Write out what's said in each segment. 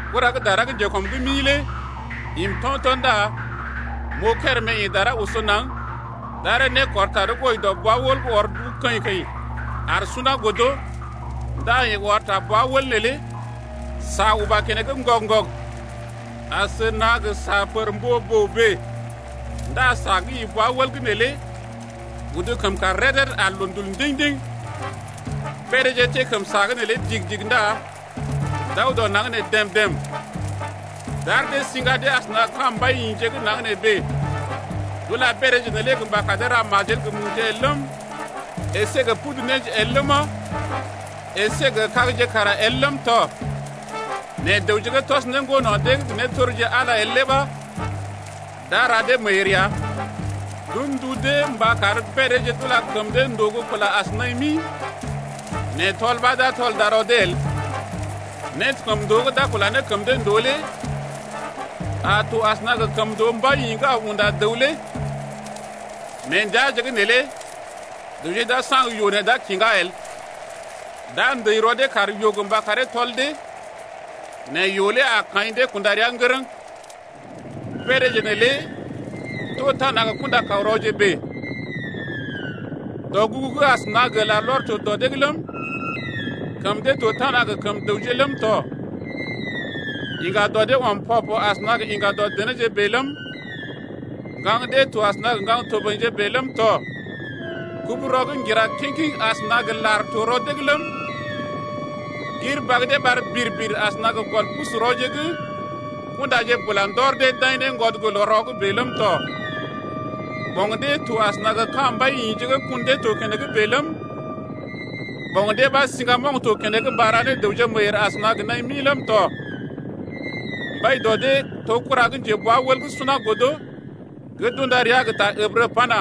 Kura gə́ dara gə́ njekɔm’g mi lé im to̰to̰ ndá m’oo kérèmé gə́ ḭ dara oso naŋg. D’aree nékɔr tarəw gə́ wɔji dɔ bwa-wəl gə́ ɔr duu keḭ-keḭ ar suna godo ndá yeḛ ɔr ta bwa-wəl neelé. Sa uba keneŋ ŋgɔg-ŋgɔg asəna gə sa pər mbo-boo bèe ndá sa gə́ ḭ bwa-wəl’g neelé udu kəm kàr rəd-rəd ar loondul ndiŋ-ndiŋ. Beedéje teḛ kəm sa’g neelé digi-digi ndá d’aw dɔ naŋg nee dèm-dèm. D’ar dee siŋga dee asəna gə ka̰ siŋga mbai-yḭje gə́ naŋg nee bèe. D’ula beedéje neelé mba kar dee ra majel gə muje el ləm, əsé gə pudu néje el ləma, əsé gə kagje kara el ləm tɔ nɛ dəwje gə́ tɔs né ŋgono̰ dee’g gə nétorji Ala el lé ɓa d’a ra dee meeyèr ya. D’un ndu dee mba kar beedéje d’ula kəm dee ndòo gə́ kula as naḭ mi nɛ tɔl ɓa d’a tɔl darɔ dee el. Nékəmndoo gə́ d’a kula ne kəm dee ndòo lé a to asəna gə kəmndoo mbai-yḭ gə́ aw unda dəw lé. Mee ndəaje’g neelé dəwje d’a saŋg yoo nɛ d’a kiŋga el, d’a ndəi rɔ dee kar yoo gə mba karee tɔl dee nɛ yoo lé a kaḭ dee kunda rəa ŋgərəŋ. Beedéje neelé to tana gə kunda-kaw-rɔje bèe. Dɔgugu gə́ asəna gə larlɔr to dɔ dee’g ləm, kəm dee to tana gə kəm dəwje ləm tɔ. Yiŋga dɔ dee ɔm pɔ-pɔ asəna gə yiŋga dɔ denéje bèe ləm, ŋgaŋ dee to asəna gə ŋgaŋ toboḭje bèe ləm tɔ. Kubu-rɔ gə́ ŋgira kiŋ-kiŋ asəna gə lar to rɔ dee’g ləm, gir bag dee ɓar bir-bir asəna gə gɔl pusu-rɔje gə́ kundaje bula ndɔr dee d’aḭ ne ŋgwɔd gə́ loo-rɔ’g bèe ləm tɔ. Ɓoŋ dee to asəna gə ka̰ mbai-yḭje gə́ kun dee to keneŋ bèe ləm, ɓoŋ dee ɓa to siŋgamoŋ to keneŋ mba ra ne dəwje meeyèr asəna gə naḭ mi ləm tɔ. Mbai dɔ dee to kura gə́ njebwa-wəl gə́ suna godo gə́ d’unda ria gə́ ta Ǝbrə pana: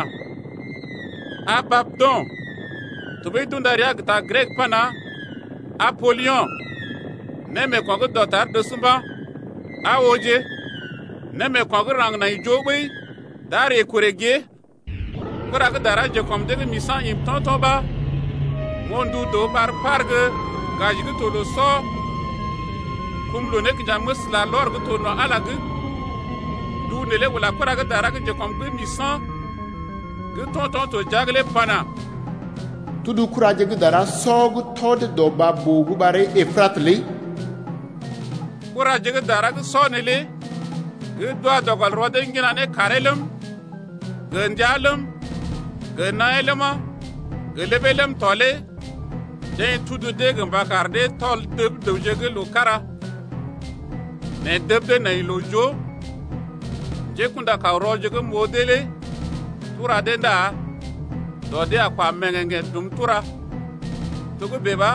Abadon tɔɓəi d’unda ria gə ta Grek pana: Apolyo̰. Némeeko̰ gə́ dɔtar dəs mba̰. Aa ooje, némeeko̰ gə́ raŋg nai joo ɓəi d’a ree korè gée. Kura gə́ dara gə́ njekɔm dee’g misa̰ im to̰to̰ ɓa m’oo ndu dəw ɓar gə́ par gə́ gaji gə́ to loo sɔ kum loo-nékinjaməs larlɔr gə́ to no̰ Ala’g. Ndu neelé ula kura gə́ dara gə́ njekɔm dee’g misa̰ lé pana: Tudu kuraje gə́ dara sɔ gə́ tɔ dee dɔ baa-boo’d gə́ ɓaree Epratə lé. Kuraje gə́ dara sɔ neelé gə́ d’wa dɔ gɔl rɔ dee ŋgina ne kàree ləm, gə ndəa ləm, gə naḭyee ləma, gə ləbee ləm tɔ lé deḛ tudu dee mba kar dee tɔl dəb dəwje gə́ loo kára, nɛ dəb dee nai loo joo. Njékṵda-kaw-rɔje gə́ m’oo dee lé tura deḛ ndá dɔ dee a kwa mèŋgèŋgḛ̀ dum tura. Togə́bè ɓa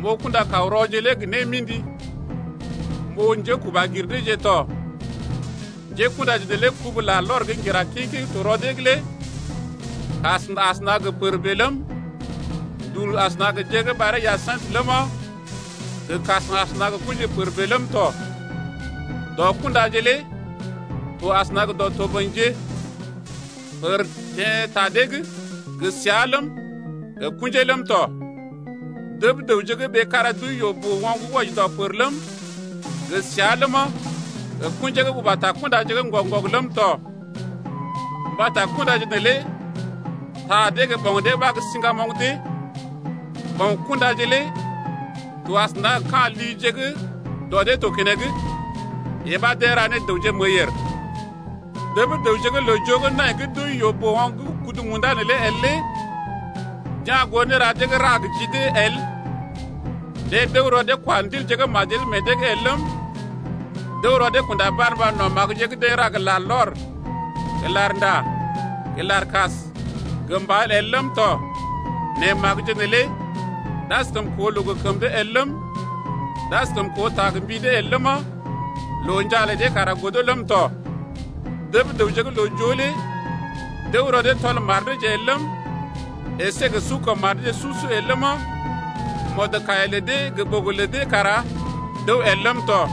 m’oo kunda-kaw-rɔje lé gə́ némḭdi, m’oo njékuba gir deeje tɔ. Njékṵdaje neelé kubu-lar gə́ ŋgira kiŋ-kiŋ gə́ to rɔ dee’g lé kas asəna gə pər bèe ləm, gə ndul asəna gə jər gə́ ɓaree hyasintə ləma, gə kas asəna gə kṵji pər bèe ləm tɔ. Dɔ kundaje lé to asəna gə dɔ toboḭje. Pər teḛ ta dee’g gə sia ləm, gə kṵjee ləm tɔ. Dəb dəwje gə́ ɓee kára d’wəi yoo-boo-oŋg wɔji dɔ pər ləm, gə sia ləma, gə kṵjee gə́ uba ta kundaje’g ŋgɔg-ŋgɔg ləm tɔ. Mbata kundaje neelé ta dee gə ɓoŋ dee ɓa gə́ siŋgamoŋ dee. Ɓoŋ kundaje lé to asəna gə ka̰ lije gə́ dɔ dee to keneŋ, yee ɓa deḛ ra ne dəwje meeyèr. Dəb dəwje gə́ loo-joo gə́ nai gə́ d’wəi yoo-boo-oŋg gə́ kudu munda nee el lé d’ya̰ goo néra dee gə́ deḛ ra gə ji dee el. Deḛ d’əw rɔ dee kwa ndilje gə́ majel meḛ dee’g el ləm, d’əw rɔ dee kunda barmba no̰ magəje gə́ deḛ ra gə larlɔr gə larnda gə larkas gə mbal el ləm tɔ nɛ magəje neelé d’askəm koo loo gə kəm dee el ləm, d’askəm koo ta gə mbi dee el ləma, loo njaa lə dee kara godo ləm tɔ. Dəb dəwje gə́ loo-joo lé d’əw rɔ dee tɔl mar deeje el ləm, əsé gə su kəm mar deeje su-su el ləma, mɔdkaiya lə dee gə ɓogo lə dee kara d’əw el ləm tɔ.